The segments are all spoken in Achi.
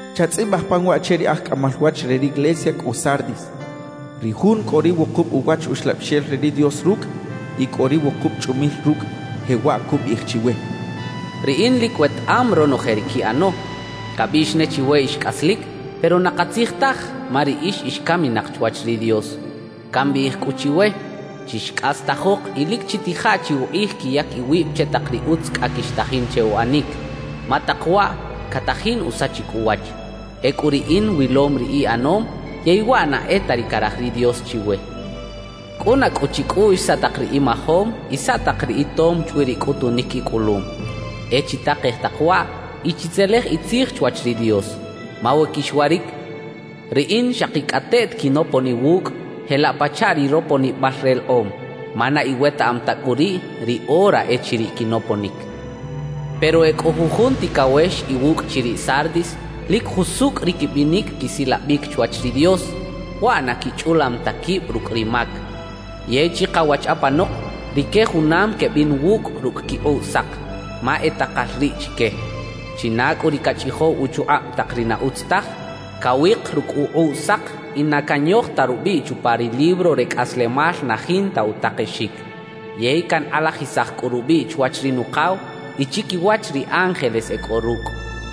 »Chatzꞌibaj pan waꞌ che ri aj cꞌamal wach re riglesia cꞌo Sardis: Ri Jun cꞌo ri wukub uwach Uxlabixel re ri Dios rucꞌ y cꞌo ri wukub chꞌumil rucꞌ, jewaꞌ cubiꞌij chiwe: Riꞌin lic wetaꞌam ronoje ri quiꞌano. Cabiꞌx ne chiwe “ix cꞌaslic”, pero na katzij taj ma riꞌix ix caminak chwach ri Dios. Cambiꞌij cꞌu chiwe: Chixcꞌastajok y lic chitija chi ukꞌij quiyac iwib che tak ri utz cꞌa quixtajin che uꞌanic, ma tak waꞌ catajin usachic uwach. Ecꞌu Riꞌin wilom ri iꞌanom, yey waꞌ na e ta ri caraj ri Dios chiwe. Cꞌuna cꞌu chicꞌuꞌx saꞌ tak ri imajom y saꞌ tak ri itom chwi ri cꞌutunic icꞌulum. E chitakej tak waꞌ y chitzelej itzij chwach ri Dios; ma we quixwaric, Riꞌin xakicꞌateꞌt quinopon iwucꞌ jelaꞌ pachaꞌ ri roponibal relekꞌom, ma na iwetaꞌam ta cꞌu riꞌ ri ora echiriꞌ quinoponic. Pero e cꞌo jujun ticawex iwucꞌ chiriꞌ Sardis lic jusucꞌ ri quibinic quisilabic chwach ri Dios, waꞌ na quichꞌulam ta quib rucꞌ ri mac. Yey chikawach apanok rique junam quebin wucꞌ rucꞌ quikꞌuꞌ sak, ma e takal riꞌ chique. China cꞌu ri cachꞌijow uchukꞌab tak ri na utz taj, cawik rucꞌ ukꞌuꞌ sak y na canyoj ta rubiꞌ chupa ri libro re cꞌaslemal na jinta utakexic. Yey cankꞌalajisaj cꞌu rubiꞌ chwach ri Nukaw y chiquiwach ri ángeles e cꞌo rucꞌ.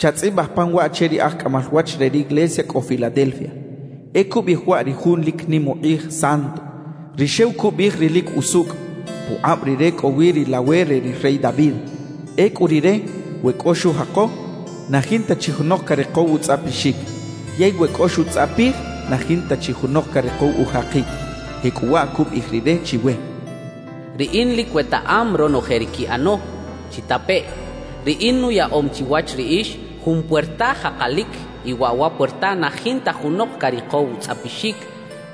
»Chatzꞌibaj pan waꞌ che ri aj cꞌamal wach re riglesia cꞌo Filadelfia: E cubiꞌij waꞌ ri Jun lic nim ukꞌij Santo, ri xew cubiꞌij ri lic usucꞌ. Pukꞌab Rire cꞌo wi ri lawe re ri rey David. Ecꞌu Rire, we cꞌo xujako, na jinta chi junok carikow utzꞌapixic; yey we cꞌo xutzꞌapij, na jinta chi junok carikow ujakic. Jecꞌuwaꞌ cubiꞌij Rire chiwe: Riꞌin lic wetaꞌam ronoje ri quiꞌano. Chitapeꞌ: Riꞌin nuyaꞌom chiwach riꞌix jun puerta jakalic y waꞌ wa puerta na jinta junok carikow utzꞌapixic;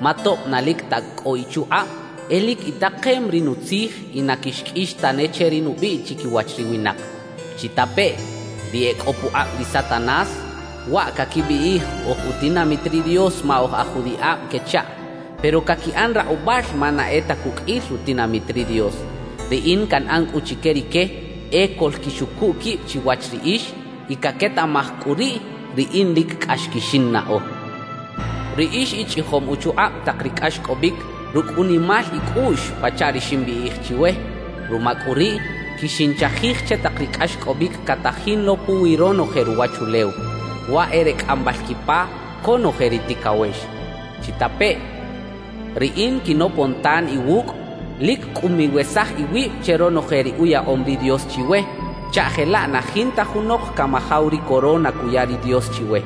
ma tob na lic ta cꞌo ichukꞌab, e lic itakem ri Nutzij y na quixqꞌuix tane che ri nubiꞌ chiquiwach ri winak. Chitapeꞌ: Ri e cꞌo pukꞌab ri Satanás (waꞌ caquibiꞌij “oj utinamit ri Dios ma oj aj judiꞌab” quechaꞌ, pero caquiꞌan rakꞌubal ma na e ta cuqꞌuil rutinamit ri Dios), Riꞌin canꞌan cꞌu chique rique e coꞌlquixucu quib chiwach riꞌix y caquetaꞌmaj cꞌu riꞌ Riꞌin lic cꞌax quixinnaꞌo. Riꞌix ichꞌijom uchukꞌab tak ri cꞌaxcꞌobic rucꞌ unimal icꞌuꞌx pachaꞌ ri ximbiꞌij chiwe; ruma cꞌu riꞌ, quixinchajij che tak ri cꞌaxcꞌobic catajin lo puwi ronoje ruwachulew, waꞌ e re cꞌambal quipa conoje ri ticawex. Chitapeꞌ: Riꞌin quinopon tan iwucꞌ; lic cꞌu miwesaj iwib che ronoje ri uyaꞌom ri Dios chiwe, chaꞌ jelaꞌ na jinta junok camajaw ri corona cuya ri Dios chiwe.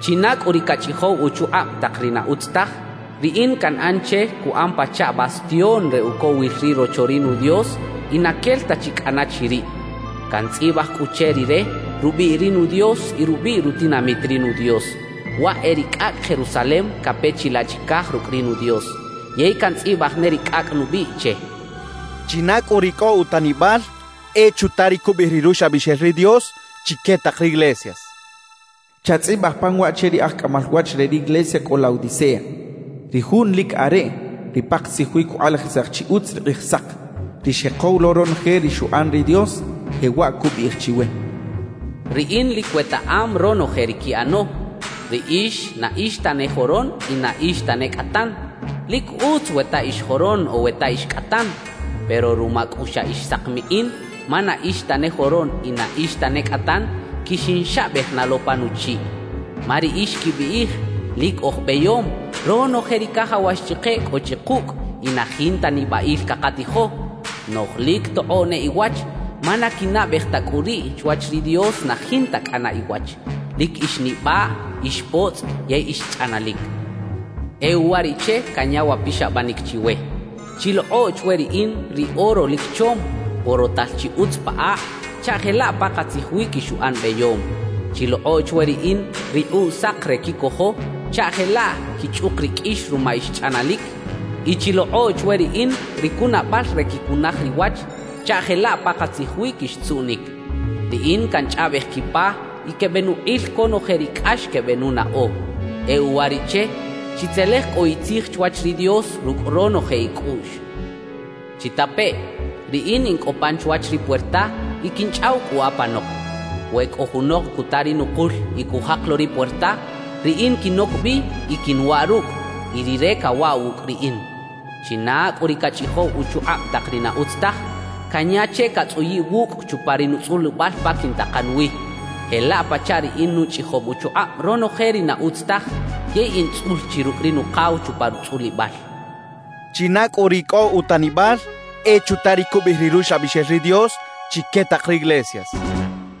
China cꞌu ri cachꞌijow uchukꞌab tak ri na utz taj, Riꞌin canꞌan che cuꞌan pachaꞌ bastión re ucowil ri Rocho ri nu Dios y na quel ta chi cꞌana chiriꞌ. Cantzꞌibaj cꞌu che rire rubiꞌ ri nu Dios y rubiꞌ rutinamit ri nu Dios, waꞌ e ri cꞌacꞌ Jerusalem cape chilaꞌ chicaj rucꞌ ri nu Dios. Yey cantzꞌibaj ne ri cꞌacꞌ nubiꞌ che. China cꞌu ri cꞌo utanibal, e chuta ri cubiꞌij ri Ruxlabixel ri Dios chique tak riglesias, cachaꞌ. »Chatzꞌibaj pan waꞌ che ri aj cꞌamal wach re riglesia cꞌo Laodicea: Ri Jun Lic Areꞌ, ri pakatzij wi cukꞌalajisaj chi utz ri Kꞌijsak, ri xjekow lo ronoje ri xuꞌan ri Dios, jewaꞌ cubiꞌij chiwe: Riꞌin lic wetaꞌam ronoje ri quiꞌano. Riꞌix na ix tane joron y na ix tane cꞌatan. ¡Lic utz we ta ix joron o we ta ix cꞌatan! Pero ruma cꞌu xa ix sakmikꞌin ma na ix tane joron y na ix tane cꞌatan, quixinxabej na lo pa nuchiꞌ. Ma riꞌix quibiꞌij: “Lic oj beyom, ronoje ri cajawax chike cꞌo chi kucꞌ y na jinta nibaꞌil cakatijo”; noꞌj lic tokꞌoꞌ ne iwach ma na quinaꞌbej ta cꞌu riꞌ chwach ri Dios na jinta cꞌana iwach, lic ix nibaꞌ, ix potzꞌ yey ix chꞌanalic. E uwariꞌche canya wa pixabanic chiwe: Chilokꞌo chwe Riꞌin ri oro lic chom, porotal chi utz pa akꞌ, chaꞌ jelaꞌ pakatzij wi quixuꞌan beyom. Chilokꞌo chwe Riꞌin rikꞌuꞌ sak re quicojo chaꞌ jelaꞌ quichꞌuk riqꞌuix ruma ix chꞌanalic y chilokꞌo chwe Riꞌin ri cunabal re quicunaj riwach chaꞌ jelaꞌ pakatzij wi quixtzuꞌnic. Riꞌin canchꞌaꞌbej quipa y quebenukꞌil conoje ri cꞌax quebenunaꞌo; e uwariꞌche chitzelej cꞌu itzij chwach ri Dios rucꞌ ronoje icꞌuꞌx. Chitapeꞌ: Riꞌin in cꞌo pan chwach ri puerta y quinchꞌaw cꞌu apanok; we cꞌo junok cuta ri nukul y cujak lo ri puerta, Riꞌin quinoc bi y quinwaꞌ rucꞌ, y rire cawaꞌ wucꞌ Riꞌin. China cꞌu ri cachꞌijow uchukꞌab tak ri na utz taj, canya che catzꞌuyiꞌ wucꞌ chupa ri nutzꞌulibal pa quintakan wi, jelaꞌ pachaꞌ Riꞌin nuchꞌijom uchukꞌab ronoje ri na utz taj yey in tzꞌul chi rucꞌ ri Nukaw chupa rutzꞌulibal. China cꞌu ri cꞌo utanibal, e chuta ri cubiꞌij ri Ruxlabixel ri Dios chique tak riglesias, cachaꞌ.»